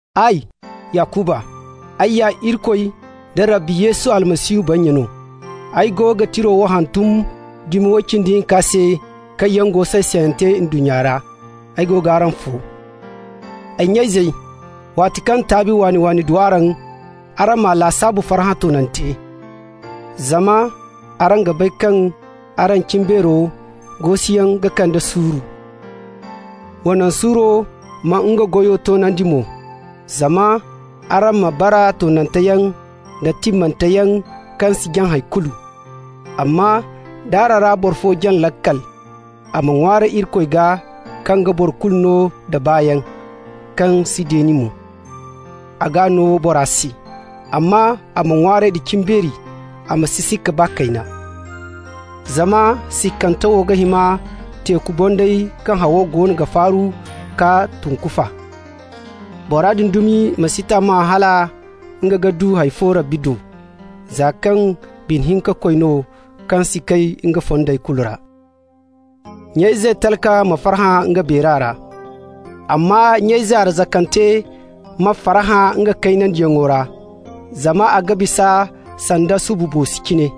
Ay, Yakuba, ay ya Irikoy da Rabbi Yesu Almasihu bannya no. Ay go ga tira wo hantum dumi way cindi hinka se kaŋ yaŋ go say-sayante ndunnya ra. Ay go g'araŋ fo. Ay nya-izey, waati kaŋ taabi waani-waani du araŋ, araŋ m'a lasaabu farhã toonante, zama araŋ ga bay kaŋ araŋ cimbeero gosiyaŋ ga kande suuru. Wa naŋ suuro ma nga goyo toonandi mo, zama araŋ ma bara toonante yaŋ da timmante yaŋ, kaŋ si jaŋ hay kulu. Amma d'araŋ ra boro fo jaŋ laakal, a ma ŋwaaray Irikoy gaa, kaŋ ga boro kulu no da baayaŋ, kaŋ si deeni mo. A g'a no bora se. Amma a ma ŋwaaray da cimbeeri, a ma si sikka baa kayna. Zama sikkante wo ga hima teeku bonday kaŋ haw goono ga faaru k'a tunkufa. Bora din dumi ma si tammahã hala nga ga du hay fo Rabbi do, za kaŋ bine-hinka-koy no, kaŋ si kay nga fondey kulu ra. Nya-ize talka ma farhã nga beera ra. Amma nya-ize arzakante ma farhã nga kaynandiyaŋo ra, zama a ga bisa sanda subu boosi cine.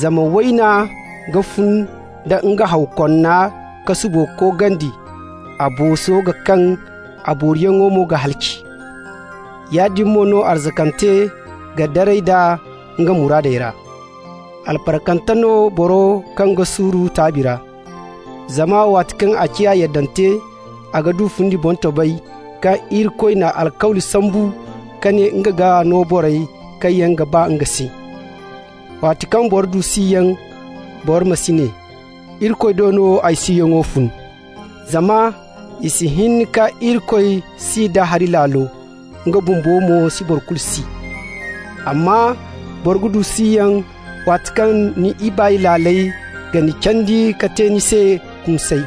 Zama wayna ga fun da nga haw konna ka subo koogandi, a booso ga kaŋ, a booriyaŋo mo ga halaci. Yaadin mo no arzakante ga daray d'a nga muraadey ra. Albarkante no boro kaŋ ga suuru taabi ra, zama waati kaŋ a ciya yaddante, a ga du fundi boŋtobay kaŋ Irikoy n'a alkawli sambu ka ne nga ga no borey kaŋ yaŋ ga ba nga se. Waati kaŋ boro du siyaŋ, boro ma si ne: «Irikoy do no ay siyaŋo fun.» Zama i si hin ka Irikoy si da hari laalo, nga bumbo mo si boro kulu si. Amma boro ga du siyaŋ waati kaŋ ni ibaay laaley ga ni candi ka te ni se kumsay.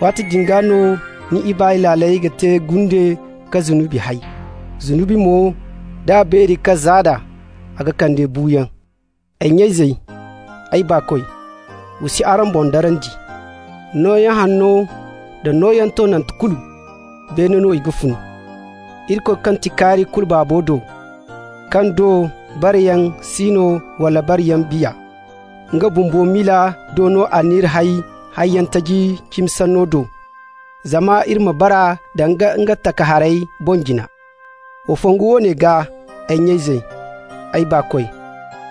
Waati din gaa no ni ibaay laaley ga te gunde ka zunubi hay. Zunubi mo, d'a beeri ka zaada, a ga kande buuyaŋ. Ay nya-izey, ay baakoy, wa si araŋ boŋ darandi. Nooyaŋ hanno nda nooyaŋ toonante kulu, beene no i ga fun, Irikoy kaŋ ti kaari kulu Baabo do, kaŋ do bareyaŋ si no wala bareyaŋ biya. Nga bumbo miila do no a n'iri hay hayyaŋ taji cimi sanno do, zama iri ma bara danga nga takaharey boŋ-jina. Wa fongu woone gaa, ay nya-izey, ay baakoy.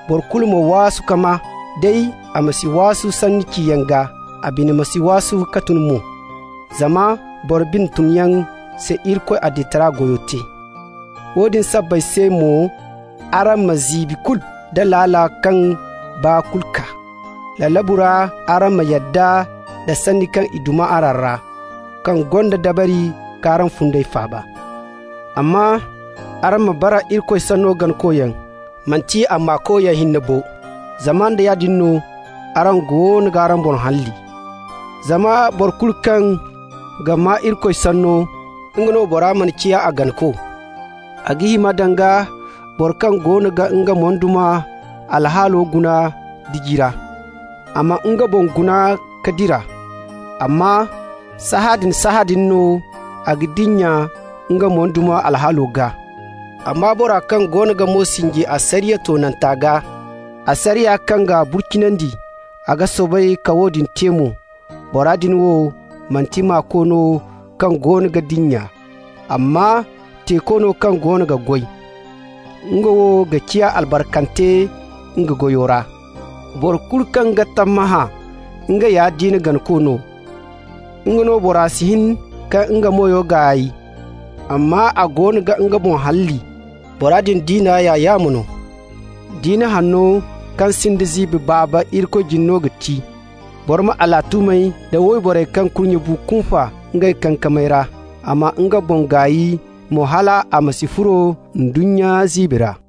Boro kulu ma waasu ka maa, day a ma si waasu sanni ciyaŋ gaa, a bine ma si waasu ka tun mo. Zama boro bine tunyaŋ si Irikoy adilitaray goyo te. Woodin sabbay se mo araŋ ma ziibi kulu nda laala kaŋ baa kulu kaa. Lalabu ra araŋ ma yadda nda sanni kaŋ i duma araŋ ra, kaŋ gonda dabari k'araŋ fundey faaba. Amma araŋ ma bara Irikoy sanno ganakoyaŋ, manti a maakoyaŋ hinne bo, zama nda yaadin no, araŋ goono g'araŋ boŋ halli. Zama boro kulu kaŋ ga maa Irikoy sanno, nga no bora mana ciya a ganako, a ga hima danga boro kaŋ goono ga nga moyduma alhaalo guna diji ra. A ma nga boŋ guna ka dira, amma sahãadin-sahãadin no a ga dinya nga moyduma alhaalo gaa. Amma bora kaŋ goono ga mo sinji asariya toonanta gaa, asariya kaŋ ga burcinandi, a ga soobay ka woodin te mo, bora din wo manti maako no kaŋ goono ga dinya, amma teeko no kaŋ goono ga goy. Nga wo ga ciya albarkante nga goyo ra. Boro kulu kaŋ ga tammahã nga ya diina ganako no, nga no bora si hin ka nga meyo gaay, amma a goono ga nga boŋ halli, bora din diina ya yaamo no. Diina hanno kaŋ sinda ziibi Baaba Irikoy jine no ga ti: boro ma alatuumey da wayborey kaŋ kurnyey bu kunfa ngey kankamey ra, a ma nga boŋ gaay mo hal a ma si furo ndunnya ziibi ra.